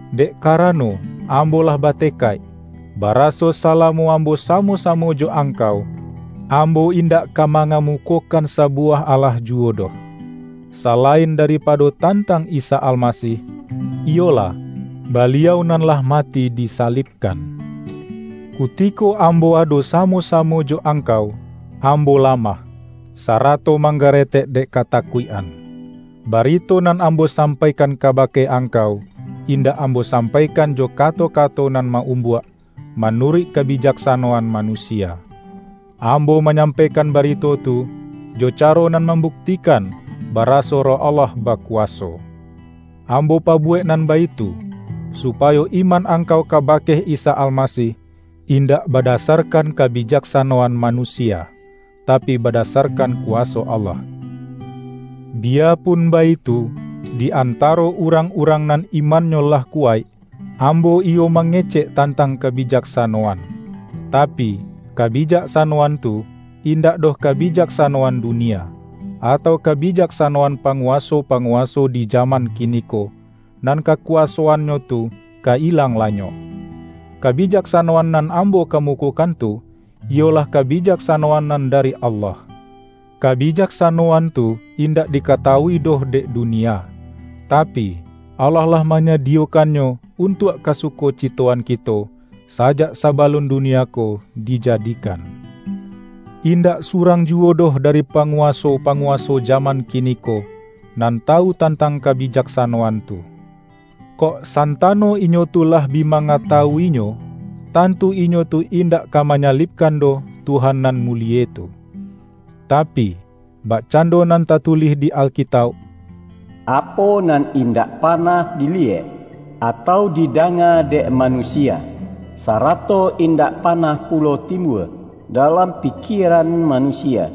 Dek kara-no, ambo lah batekaik, baraso salamo ambo samo-samo jo angkau, ambo in-dak ka mangamukokan sabuwah alah juwo doh, salain daripado tantang Isa Almasih; iyolah, Baliau nan lah mati disalibkan. Kutiko ambo ado samo-samo jo angkau, ambo lamah, sarato manggaretek dek katakuik-an. Barito nan ambo sampaikan kabake angkau, indak ambo sampaikan jo kato-kato nan ma-umbuak, manuruik kabijaksa-noan manusia. Ambo manyampaikan barito tu, jo caro nan mambuktikan baraso Roh Allah bakuwaso. Ambo pabuwek nan baitu, supayo iman ang-kau kabake Isa Almasih, indak bada-sarkan kabijaksanoan manusia, tapi badasarkan kuwaso Allah. Biyapun baitu, di antaro urang-urang nan imannyo lah kuwaik, am-bo iyo mangecek tantang kabijaksa-noan. Tapi, kabijaksanoan tu, indak doh kabijaksanoan dunia, atau kabi-jaksanoan panguwaso-panguwaso di jaman kiniko, nan kakuwasoannyo tu ka ilang lanyok. Kabijaksanoan nan ambo kamukokan tu, iyolah kabijak-sanoan nan dari Allah. Kabijaksanoan tu indak dikatawui doh dek dunia, tapi, Allah lah manyadiyokannyo un-tuak kasukocitoan kito, sajak sabalun dunia ko dijadikan. Indak surang ju-wo doh dari panguwaso-panguwaso jaman kiniko, nan tawu tantang ka-bijaksanoan tu. Kok santano inyo tu lah bi mangatawu-inyo, tantu inyo tu indak ka manyalibkan doh Tuhan nan mulie tu. Tapi, bakcando nan tatu-lih di Alkitauk,”Apo nan indak panah diliyek, atau didanga dek manusia, sarato indak panah pulo timbua dalam pikieran manusia,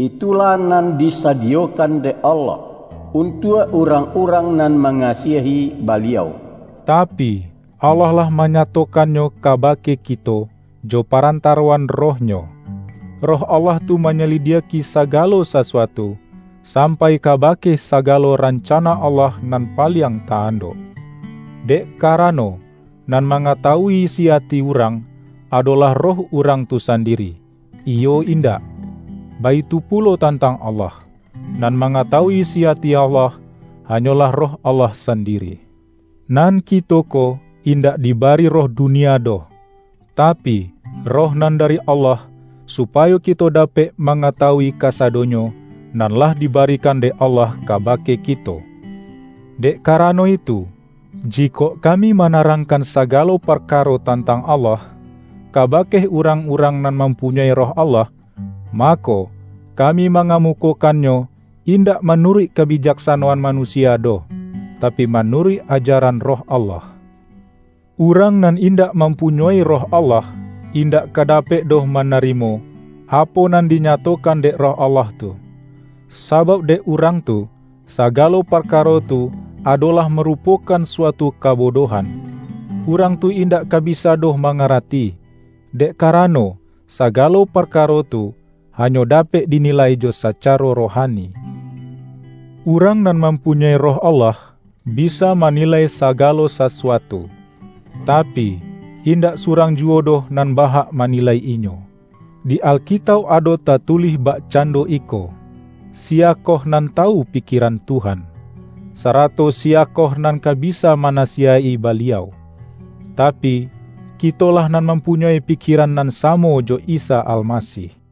itulah nan disadiyokan dek Allah, untuak urang-urang nan mangasiahi Baliau.” Tapi, Allah lah manyatokannyo ka-bake kito, jo parantaroan Roh-Nyo. Roh Allah tu manyalidiak-i sagalo sasuatu, sampai kabake sagalo rancana Allah nan paliang ta-andok. Dek karano, nan mangatawui isi ati urang, adolah roh urang tu sandiri, iyo indak? Baitu pulo tantang Allah. Nan mangatawui isi ati Allah, hanyolah Roh Allah san-diri! Nan kito ko, indak dibari roh dunia doh, tapi, Roh nan dari Allah, supayo kito dapek mangatawui kasa-donyo, nan lah dibarikan dek Allah kabake kito. Dek karano itu, jikok kami ma-narangkan sagalo parkaro tantang Allah, kabake urang-urang nan mampunyoi Roh Allah, mako, kami mangamukokannyo, indak manuruik kabijaksanoan manusia doh, tapi ma-nuruik ajaran Roh Allah. Urang nan indak mampunyoi Roh Allah, indak ka dapek doh manarimo, apo nan dinya-tokan dek Roh Allah tu. Sabauk dek urang tu, sagalo parkaro tu adolah marupokan suatu kabodohan. Urang tu indak ka bisa doh mangarati, dek karano, sagalo parkaro tu, hanyo dapek dinilai jo sacaro rohani. Urang nan mampunyoi Roh Allah, bisa mani-lai sagalo sasuatu, tapi, indak surang juwo doh nan bahak manilai inyo. Di Alkitauk ado tatulih bakcando iko,”Siyakoh nan tawu pikieran Tuhan? Sarato siyakoh nan ka bisa manasiyaik-i Baliau?" Tapi, kitolah nan mampunyoi pikieran nan samo jo Isa Almasih!